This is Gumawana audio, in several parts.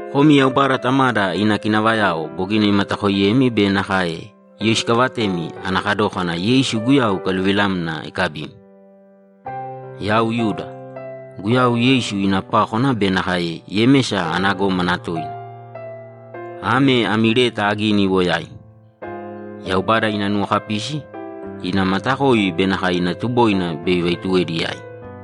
Komi Yaubada Tamada ina kinavayao bogina imatakoiyemi be nakae iyoisikavatemi ana kadókana Yeisu Guyau ikaluvilamna ikabimi, Yau Yuda, Guyau Yeisu ina pákwana be nakae Yemesa ana gómana toina, ame ami leta agini iwo yaimi. Yaubada ina nuwokapisi, ina matakoi be nakae ina tuboina bei ivaituwedi yaimi.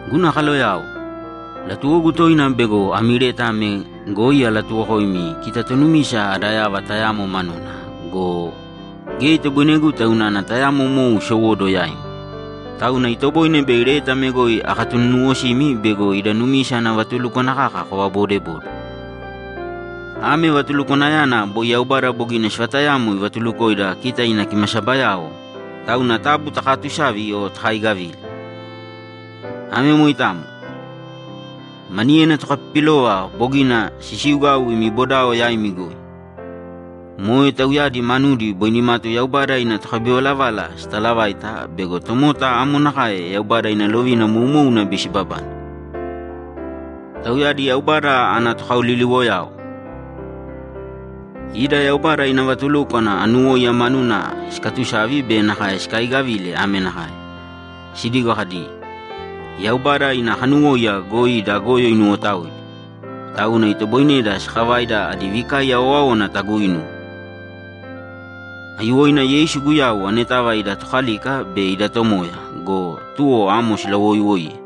Guna kaloyao, latuwogu toina bego ami leta ame goi alatuwokoimi kita tonumisa ada yava tayamo manuna go, geya itoboineguta unana tayamo mou isowóduwo yaimi, tauna itoboine bei leta ame goi akatununuwosimi bego ida numisa ana vatulúkwana kaka kovaboodebode. Ame vatulukwanayana boi Yaubada bogina sivatayamo ivatulukoida kita ina kimasabayao, tauna taabu takaatusāvi o takaaigavīle. Ame moitamo. Maniyena tokapipilova bogina sisiugau imi bodao yaimi goi. Moe tauyadi manudi boi nimatu Yaubada ina tokabivalavala sitalavaita bego tomota amo nakae Yaubada ina lovina moumouna bei sibabane. Tauyadi Yaubada ana tokaoliliwoyao. Ida Yaubada ina vatulúkwana anuwóiya manuna sikaatusavi be nakae sikaiigavile ame nakae: Sidigo kadi, ‘Yaubada ina kanuwóiya goi ida goyo inuwotaoidi, tauna itoboineda sakavaida adi vikaiya owáowana taguuinuwe.’ Aiyuwoina Yeisu Guyau anetava ida Tokalika be ida Tomoya go, tuwo amo silawoiiwoiye!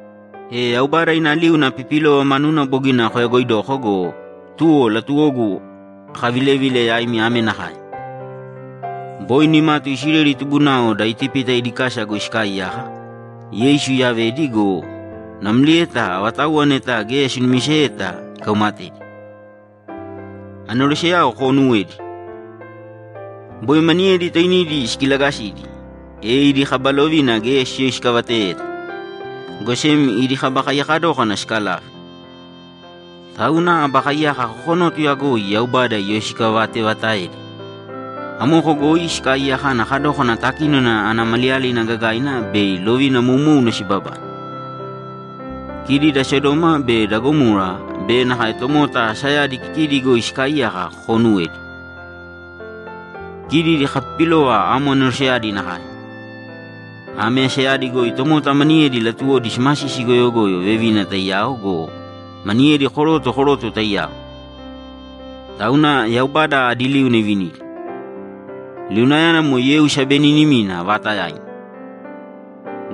E Yaubada ina liuna apipilova manuna bogina koyagoidoko go, tuwo latuwogu akavilevile yaimi ame nakae: Boi nimatu Isileli tubunao da Itipita idi kasa goi sikaaiyaka, Yeisu iyavedi go, namlieta avatauwa neta geya sinumiseyeta ikaumatedi. Aneroseyao koonuwēdi. Boi maniyedi toinidi sikilagasidi, e idi kaba lovina geya siyoisikavateyeta, go sem idi kaba kaiyaka dókana sikalave. Tauna aba kaiyaka kokonótuya goi Yaubada iyoisikavateevataedi. Amoko goi sikaaiyaka ana kadókana takínona ana maliyalina gagaina bei lovina moumouna sibabane. Kidi da Sodoma be da Gamora be nakae tomota asayadi kikidi goi sikaaiyaka koonuwēdi. Kidi idi kapipilova amo aneroseyadi nakae. Ame asayadi goi tomota maniyedi latuwodi simasisi goyogoyo vevina taiyao go, maniyedi koroto koroto taiyao. Tauna Yaubada adi liuna ivinidi; liunayana moe yeu sabenínima vaatayaina.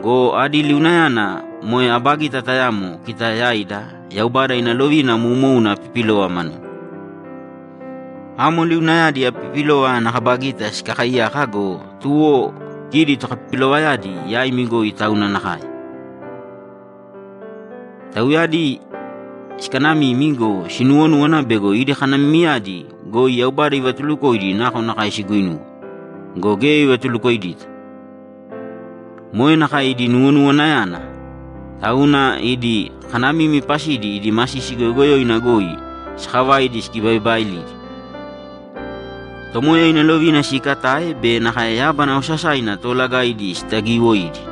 Go adi liunayana moe aba gita tayamo kita yaida Yaubada ina lovina moumouna apipilova manuna. Amo liunayadi apipilova ana kaba gita sikakaiyaka go, tuwo kidi tokapipilovayadi yaimi goi tauna nakae. Tauyadi sikanamimi go, sinuwonúwana bego idi kanamimiyadi goi Yaubada ivatulukoidi nakonakae siguinuwe, go geya ivatulukoidita. Moe nakae idi nuwonuwanayana, tauna idi kanamimi pasidi idi masisi goyogoyoina goi sakavaidi sikibaibaailidi, Tomoya ina lovina siikatae be nakae yábana osasaina toolagaidi sitagiiwoidi.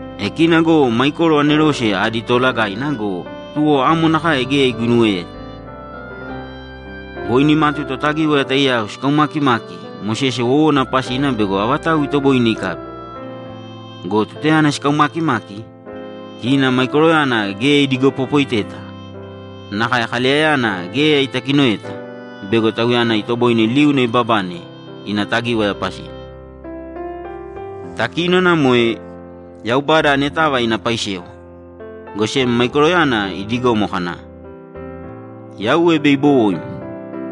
E kina go Maikoro anerose adi toolagaina go, tuwo amo nakae geya iguinuweyeta. Boi nimatu Totagíwaya taiyao sikaumakimaki Mosese wowona pasina bego avatau itoboine ikabi. Go tutayana sikaumaakimaki, kina Maikoroyana geya idigopopoiteta, nakae Kaleyayana geya itakinoeta bego tauyana itoboine liuna ibabane ina tagíwaya pasina. Takínona moe Yaubada anetava ina paisewa. Go sem Maikoroyana idigomo kana, ‘Yauwe bei ibowoim,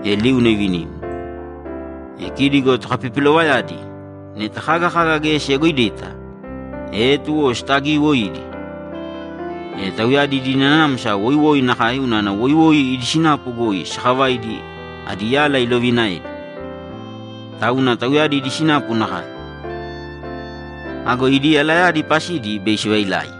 e liuna ivinim!’ E kidi go tokapipilovayadi, neta kaga kaga geya siyagoidita, e tuwo sitagiiwoidi. E tauyadi idi nanamsa woiwoi nakae unana woiwoi idi sinapu goi sakavaidi adi yala iloviinaedi. Tauna tauyadi idi sinapu nakae. Ago idi yalayadi pasidi bei sivailai.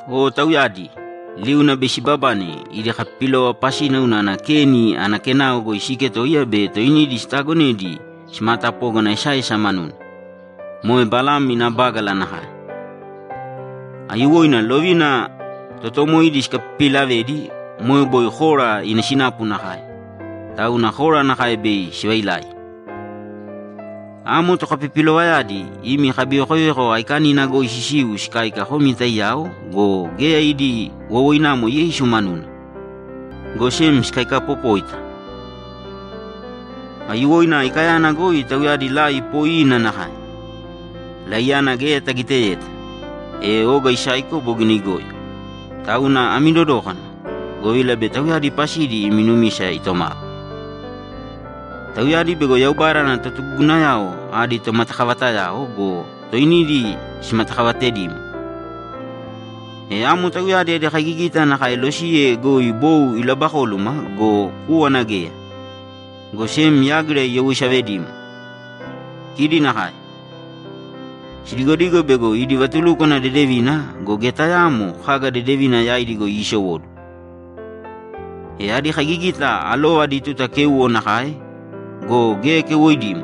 O tauyadi! Liuna bei sibabane idi kapipilova pasina unana Keni ana kenao goi siiketoiya be toinidi sitaagonedi simaatapógana esaesa manuna, moe Balam ina bágala nakae. Aiyuwoina lovina totoomoidi sikapipiilavedi moe boi Kora ina sinapu nakae, tauna Kora nakae bei sivailai. Amo tokapipilovayadi imi kabivekoveko aikanina goi sisiu sikáika komi taiyao go, geya idi wowoinamo Yeisu manuna, go sem sikaikapopóita. Aiyuwoina aikayana goi tauyadi lai poiina nakae. Laiyana geya tagiteyeta, e oga isaiko bogina igoyo, tauna ami dodōkana, govila bei tauyadi pasidi imi numisa itomava. Tauyadi bego Yaubada ana totugugunayao adi tomatakavatayao go, toinidi simatakavatedimo. E amo tauyadi adi kaigigita nakae losiye goi bou ilabakóluma go, kúwana geya, go sem yágira iyawoisavedimo. Kidi nakae. Sidigodigo bego idi vatulúkwana dedevina go, geya tayaamo kaga dedevina yaidi goi iisowóduwo. E adi kaigigita alova adi tuta kéuwo nakae go, geya keuwoidimo,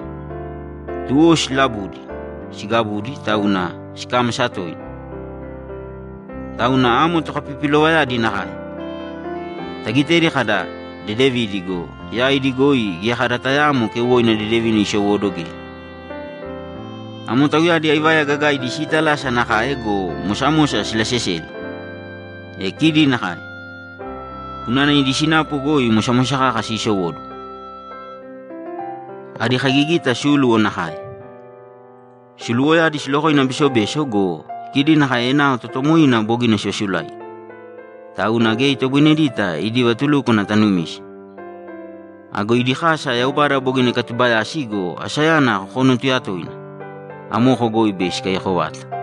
tuwo silabudi, sigabudi, tauna sikámasa toina. Tauna amo tokapipilovayadi nakae. Tagitedi kada, ‘Dedevidi’ go, yaidi goi geya kada tayaamo keuwoina dedevina isowóduwo geya. Amo tauyadi aivaya gagaidi siitalasa nakae go, mosamosa silaseseli. E kidi nakae, unana idi sinapu goi mosamosa kaka sisowóduwo. Adi kaigigita súluwo nakae. Suluwoyadi silokoina besobeso go, kidi nakae enao totoomoina bogina sivasulaigi, tauna geya itoboinedeta idi vatulúkwana tanumise. Ago idi kasa Yaubada bogina ikatubayasi go, asayana kokonótuya toina. Amoko goi bei sikaiyako vata.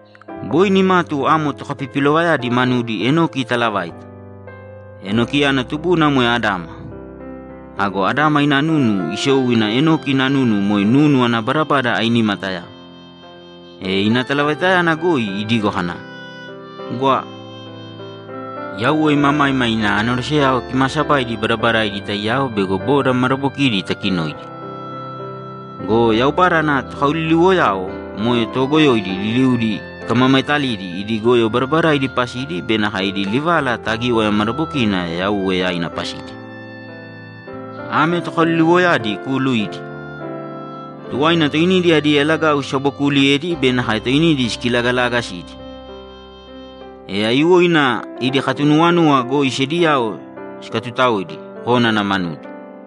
Boi nimatu amo tokapipilovayadi manudi Enoki itaalavaita. Enokiyana tubuna moe Adama. Ago Adama ina nunu isou ina Enoki ina nunu moe nunu ana badabada ainima tayamo. E ina talavaitayana goi idigo kana, ‘Gwa! Yauwe imamaima ina aneroseyao kimaasabaidi badabadaidi taiyao bego boda madabokidi itakinoidi. Go Yaubada ana tokaoliliwoyao moe toogoyoidi liliudi ikamamaetalidi idi goyo badabadaidi pasidi be nakae idi livala tagíwaya madabokina Yauwe yaina pasidi.’ Ame tokaoliliwoyadi kuuluidi. Tuwaina toinidi adi yalagau sisabokuuliyedi be nakae toinidi sikilagalaagasidi. E aiyuwoina idi katunuwanuwa goi sediyao sikatutaoidi kónana manudi.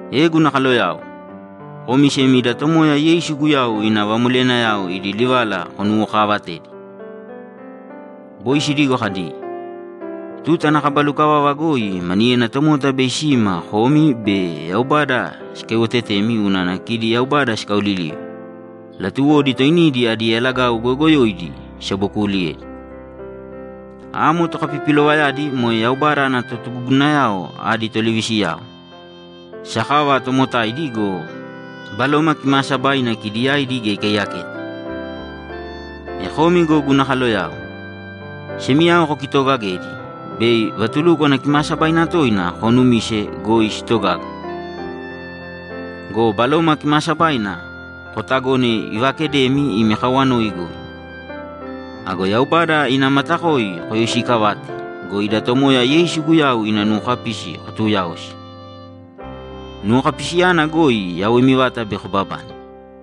E guna kaloyao, komi sem ida Tomoya Yeisu Guyau ina vamoleyanayao idi livala konuwokaavatēdi. Boi sidigo kadi, ‘Tuta ana kaba lukavava goi maniyena tomota bei sima komi be Yaubada sikaiwotetemi unana kidi Yaubada sikaolilive; latuwodi toinidi adi yalagau goyoogoyoidi sisabokuliyedi.’ Amo tokapipilovayadi moe Yaubada ana totugugunayao adi tolivisiyao, sakava tomotaidi go, Baloma Kimaasabaina kidi yaidi geya ikaiyaketa. E komi go guna kaloyao, semiyao kokitoogagēdi, bei vatulúkwana kimaasabaina toina koonumise goi sitogaga. Go Baloma Kimaasabaina kootagōne ivaakedemi imi kawanoi goi. Ago Yaubada ina matakoi koyoisiikavāte go, ida Tomoya Yeisu Guyau ina nuwokapisi kotuuyaōsi. Nuwokapisiyana goi yawoimi vata bei kobabane.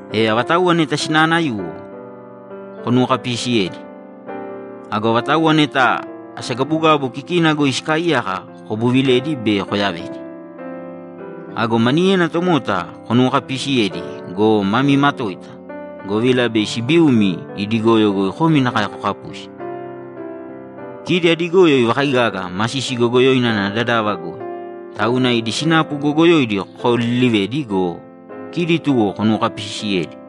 E avatauwa neta sinaanayuwo, konuwokapiisiyēdi. Ago avatauwa neta asagabugabu kikina goi sikaaiyaka kobuvilēdi be koyavēdi. Ago maniyena tomota konuwokapiisiyēdi go, mami matōita, govila bei sibiumi idi goyo goi komi nakae kokapusi. Kidi adi goyo ivakaigaga masisi goyogoyoina ana dadava goi, tauna idi sinapu goyogoyoidi kokaoliilivēdi go, kidi tuwo konuwokapiisiyēdi.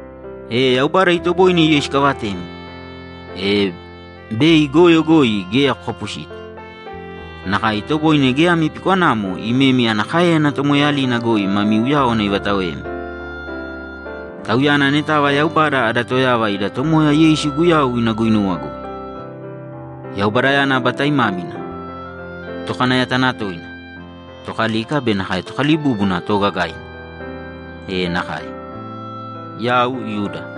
E Yaubada itoboine iyoisikavatemi, e bei goyo goi geya kokapusita. Nakae itoboine geya ami pikwanamo imemi ana káeyana tomoeeyalina goi mami uyáwana ivataoemi. Tauyana anetava Yaubada ada Toyava ida Tomoya Yeisu Guyau ina guinuwa goi. Yaubadayana aba taimámina, Tokanayatanatoina, Tokalika be nakae Tokalibúbuna toogagaina! E nakae! Yau Yuda